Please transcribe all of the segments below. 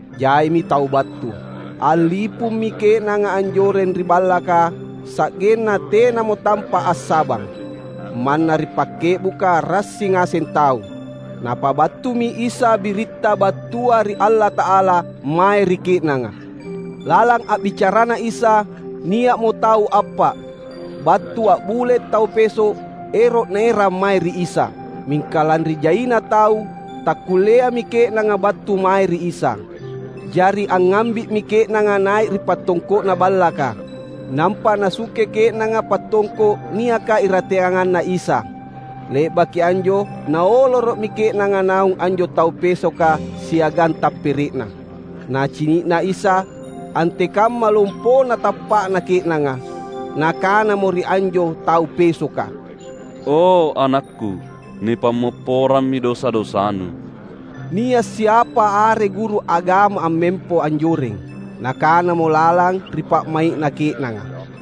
Jaimi tau battu. A’lipummi ke’nanga anjoreng ri ballaka, sa’genna tenamo tampa’ assabang. Manna ri pakke’buka rassi ngaseng tau. Napabattumi Isa biritta battua ri Allata’ala mae ri ke’nanga. Lalang a’bicaraNa Isa, nia’mo tau appa’ battu a’bule’ tau peso’, ero’ naerang mae ri Isa. Mingka lanri jaina tau, takkulleami ke’nanga battu mae ri Isa. Jari angngambi’mi ke’nanga nai’ ri pattongko’na ballaka. Nampa nasungke ke’nanga pattongko’ niaka irateanganna Isa. Le’baki anjo naoloro’mi ke’nanga naung anjo tau pesoka siagang tappere’na. Nacini’na Isa antekamma lompona tappa’na ke’nanga, Nakanamo ri anjo tau pesoka, "O anakKu, nipammopporammi dosa-dosanu." Nia’ siapa are guru agama ammempo anjoreng. Nakanamo lalang ri pa’mai’na ke’nanga.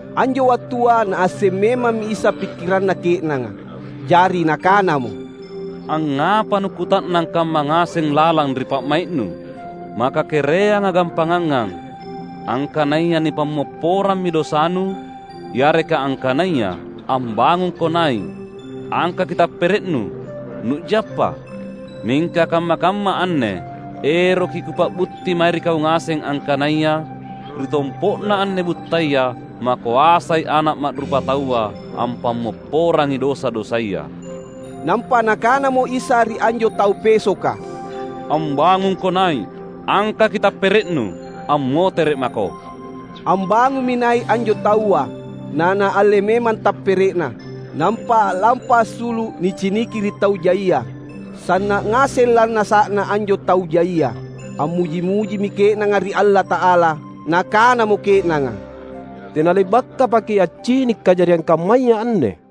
Anjo wattua Naasseng memammi Isa pikkiranna ke’nanga. Jari Nakanamo, "Angngapa nukkuta’nang kamma ngaseng lalang ri pa’mai’nu? Maka kereanga gampangangang: angkanaya, ‘Nipammopporammi dosanu’ yareka angkanaya, ‘Ambangungko nai’, angkaki tappere’nu, nu’jappa’? Mingka kamma-kamma anne eroki Kupa’butti mae ri kau ngaseng angkanaya ri tompo’na anne buttaya makoasai Ana’ Ma’rupataua ampammopporangi dosa-dosaya." Nampa Nakanamo Isa ri anjo tau pesoka, "Ambangungko nai’, angkaki tappere’nu, ammotere’ mako!" Ambangummi nai’ anjo taua, na naalle memang tappere’na, nampa a’lampa assulu’ niciniki ri tau jaia. Sanna’ ngaseng lannasa’na anjo tau jaia. Ammuji-mujimi ke’nanga ri Allata’ala. Nakanamo ke’nanga, "Tena le’bakkapaki’ accini’ kajariang kammaya anne!"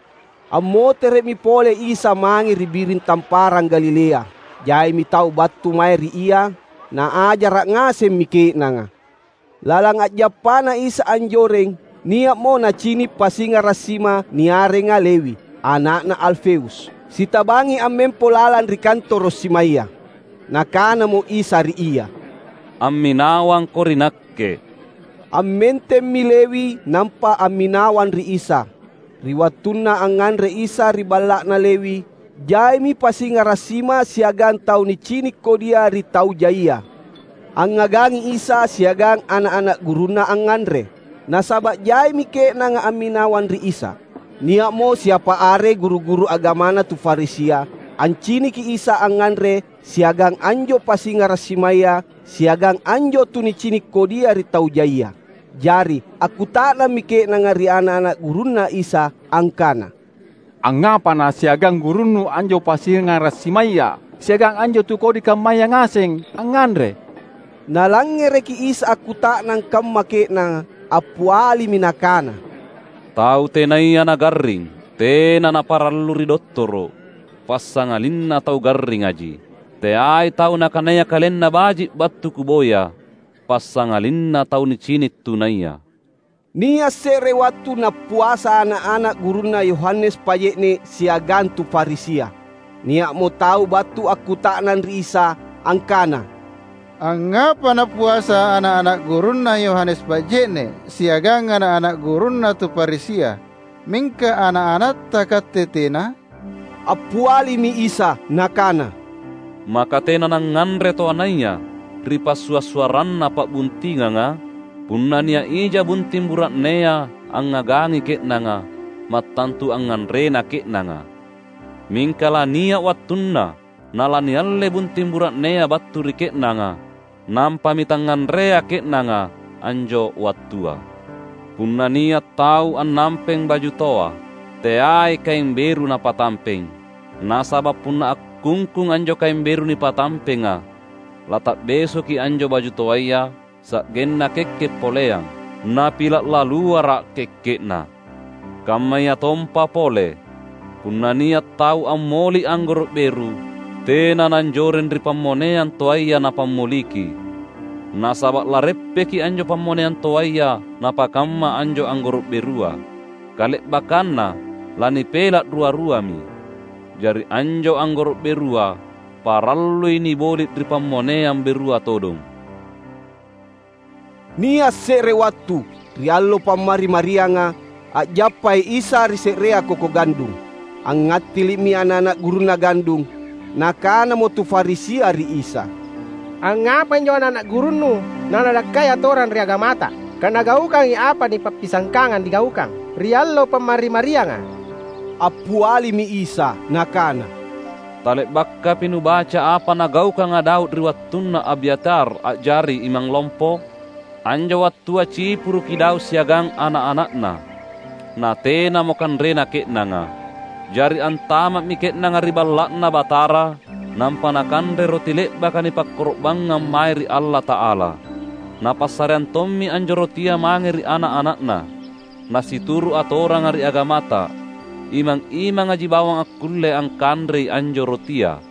Ammotere’mi pole Isa mange ri biring Tamparang Galilea. Jaimi tau battu mae ri Ia. Naajara’ ngasemmi ke’nanga. Lalang a’jappaNa Isa anjoreng, nia’mo Nacini’ pasingara’ sima niarenga Lewi, ana’na Alfeus. Sitabangi ammempo lalang ri kantoro’ simaya. Nakanamo Isa ri ia, "Amminawangko ri Nakke." Ammentemmi Lewi nampa amminawang ri Isa. Ri wattunna angnganre Isa ri balla’na Lewi, jaimi pasingara’ sima siagang tau nicini’ kodia ri tau jaia, angngagangi Isa siagang ana’-ana’ gurunNa angnganre. Nasaba’ jaimi ke’nanga amminawang ri Isa. Nia’mo siapa are guru-guru agamana tu Farisia anciniki Isa angnganre siagang anjo pasingara’ simaya siagang anjo tu nicini’ kodia ri tau jaia. Jari akkuta’nammi ke’nanga ri ana’-ana’ gurunNa Isa angkana, "Angngapa nasiagang gurunnu anjo pasingara’ simaya siagang anjo tu kodi kammaya ngaseng, angnganre?" Nalangngereki Isa akkuta’nang kamma ke’nanga, appialimi Nakana, "Tau tenaya nagarring, tena naparallu ri dottoro’, passangalinna tau garringaji. Teai tau nakanaya kalenna baji’ battu Kuboya, passangalinna tau nicini’ tunaya." Nia’ se’re wattu nappuasa ana’-ana’ gurunna Yohanes Paje’ne’ siagang tu Farisia. Nia’mo tau battu akkuta’nang ri Isa angkana, "Angngapa nappuasa ana’-ana’ gurunna Yohanes Paje’ne’ siagang ana’-ana’ gurunna tu Farisia, mingka ana’-anatTa Katte tena?" Appialimi Isa Nakana, "Maka tena nangnganre toanaya ri passua’-suarranna pa’buntinganga? Punna nia’ ija bunting bura’nea angngagangi ke’nanga, mattantu angnganrena ke’nanga. Mingka lania’ wattunna na lanialle bunting bura’nea battu ri ke’nanga. Nampami tangnganrea ke’nanga anjo wattua. Punna nia’ tau annampeng baju toa, teai kaeng beru napatampeng. Nasaba’ punna akkungkung anjo kaeng beru nipatampenga lata’besoki anjo baju toaya sa’genna kekke’ poleang, napila’ laluara’ kekke’na. Kammayatompa pole, punna nia’ tau ammoli’ anggoro’ beru, tena nanjoreng ri pammoneang toaya na pammoliki. Nasaba’ lareppeki anjo pammoneang toaya napakamma anjo anggoro’ berua. Kale’bakkanna lanipela’ rua-ruami. Jari anjo anggoro’ berua, parallui niboli’ ri pammoneang berua todong!" Nia’ se’re wattu, ri allo Pammari-marianga, a’jappai Isa ri se’reang koko gandung. Angngattili’mi ana’-ana’ gurunNa gandung. Nakanamo tu Farisia ri Isa, "Angngapai anjo ana’-ana’ gurunNu na nadakkai atoranga ri agamata, kanagaukangi apa nipappisangkanga nigaukang ri allo Pammari-marianga?" Appialimi Isa Nakana, "Tale’bakapi nubaca apa nagaukanga Daud ri wattunna Abyatar a’jari imang lompo? Anjo wattua cipuruki Daud siagang ana’-ana’na. Na tenamo kanrena ke’nanga. Jari antama’mi ke’nanga ri Balla’Na Batara, nampa nakanre roti le’baka nipakkoro’bangngang mae ri Allata’ala. Napassareang tommi anjo rotia mange ri ana’-ana’na. Na situru’ atoranga ri agamata, imang-imangaji bawang akkulle angkanrei anjo rotia."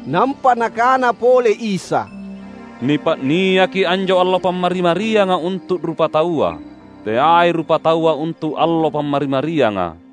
Nampa Nakana pole Isa, "Nipa’niaki anjo allo Pammari-marianga untu’ rupataua; teai rupataua untu’ allo Pammari-marianga.